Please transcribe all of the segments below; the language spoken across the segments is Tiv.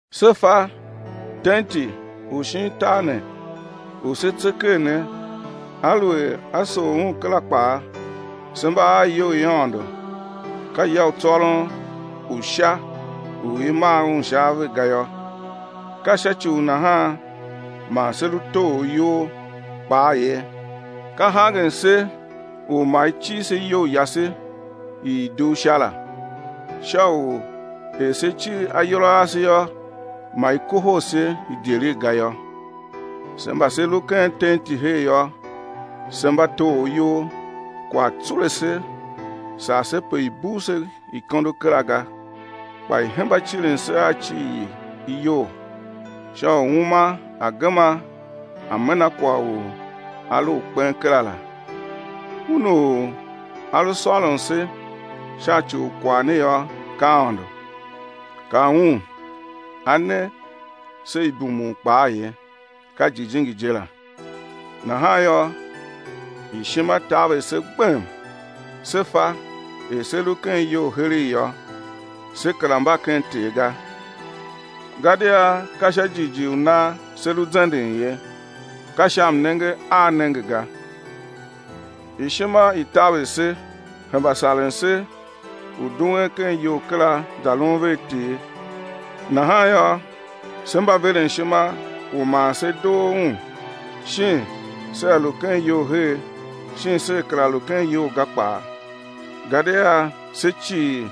Se fa tenti u shin tar ne u se tse ker ne, aluer á sough un kera kpaa, se mba a iyou i Aôndo, ka ya u tsôron u Sha u i maa un sha ave ga yô. Ka sha ci u nahan man se lu toghor iyol kpaa ye, ka hangen se u ma i cir se iyou yase i i dugh Sha la; sha er se cir ayol a ase yô, ma i kohol se idyelegh ga yô. Se mba se lu ken tenti her yô, se mba toghor iyol, kwagh tsule se, sar se pe i̱ bugh se ikondo kera ga, kpa i̱ hemba cirin se a cir i iyol, sha u uma a̱ gema a̱ mena kwagh u a lu u kpen kera la. Un u A lu sôron se sha ci u kwagh ne yô ka Aôndo, ka Un A ne se ibumun kpaa ye, ka Jijingi je la. Nahan yô, ishima taver se gbem, se fa, er se lu ken iyol heregh yô, se kera mba ken Ter ga. Gadia ka sha jighjigh u nan se lu zenden ye, ka sha mnenge a nenge ga. Ishima i taver se, hemba saren se u duen ken iyol kera za lun vea Ter. Nahan yô, se mba veren ishima u ma se doo Un, shin sea lu ken iyol her shin sea kera lu ken iyol ga kpaa. Gadia se cii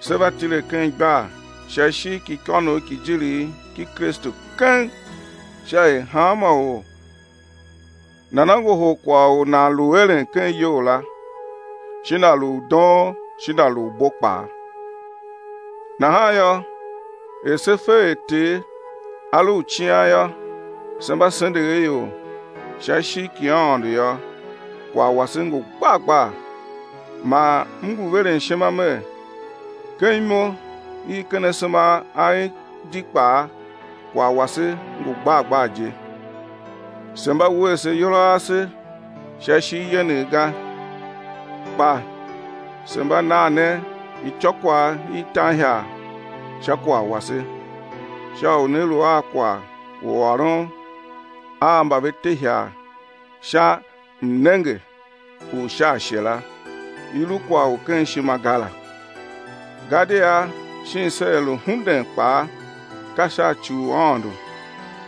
sé va tile ken igbar sha ishigh ki ikônough ki ijirigh ki Kristu keng, sha er hanma or nana ngohol kwagh u nan lu eren ken iyol la shin a lu u doon shin a lu u bo kpaa. Nahan yô, er se fe er Ter a lu u cian yô, se mba sendegh a ior; sha ishigh ki Aôndo yô, kwagh wase ngu gbar gbar, man m ngu veren ishima mer, ken imo i ken asema a en di kpaa kwagh wase ngu gbar gbar je. Se mba wuese ayol a ase sha ishigh yenegh ga, kpa se mba nan ne ityôkwagh i tan ihagh sha kwagh wase, sha u né lu a kwagh u ôron a mba ve te ihagh sha mnenge u sha ashe la, i lu kwagh u ken ishima ga la. Gadia shin sea lu hunden kpaa, ka sha ci u Aôndo,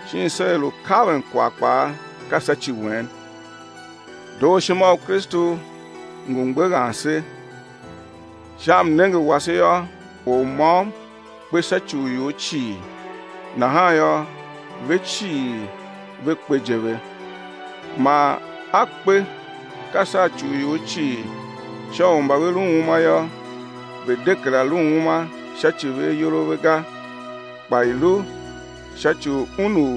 shin sea lu kaven kwagh kpaa, ka sha ci wen. Dooshima u Kristu ngu mgbeghan se, sha mnenge wase yô or môm kpe sha ci u ior cii, nahan yô, ve cii ve kpe je ve. Man A kpe ka sha ci u ior cii sha u mba ve lu uma yô, ve̱ de kera lu uma sha ci ve ayol a ve ga, kpa i̱ lu sha ci u Un u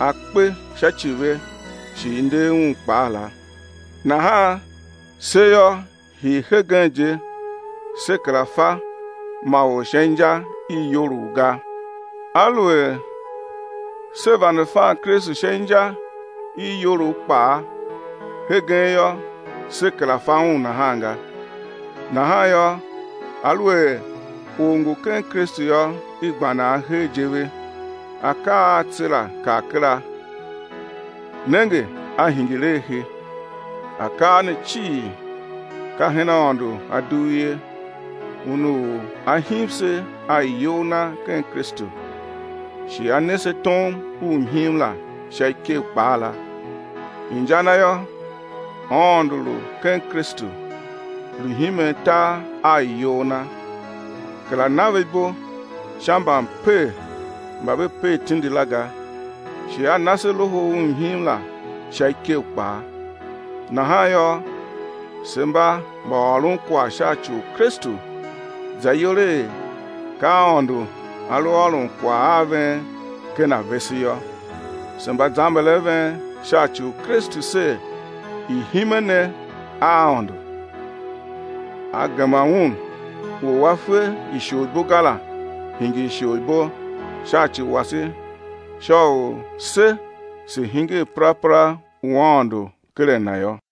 A kpe sha ci ve shi i nder Un kpaa la. Nahan se yô, hii hegen je se kera fa ma or sha inja i iyolough ga. Aluer se vande fan Kristu sha inja i iyolough kpaa, hegen yô, se kera fa Un nahan ga. Nahan yô, aluer or ngu ken Kristu yô, i gba nan hegh je ve, akaa a tse la kar kera, nenge a hingir a he. Akaa ne cii ka hen Aôndo A dugh ye, Un u A him se a iyol Na ken Kristu, shi A ne se tom u mhim la sha ikev kpaa la. Inja na yô, Aôndo lu ken Kristu, lu himen tar a iyol Na, kera na ve ibo sha mbamper mba ve per tindi la ga, shi A na se loho u mhim la sha ikev kpaa. Nahan yô, se mba mbaôronkwagh sha ci u Kristu za iyol er ka Aôndo A lu ôron kwagh a ven ken a vese yô. Se mba zamber a ven sha ci u Kristu ser, i̱ hime ne a Aôndo. A gema Un u A fe isholibo ga la, hingir isholibo sha ci wase sha u se se̱ hingir perapera u Aôndo ken a Na yô.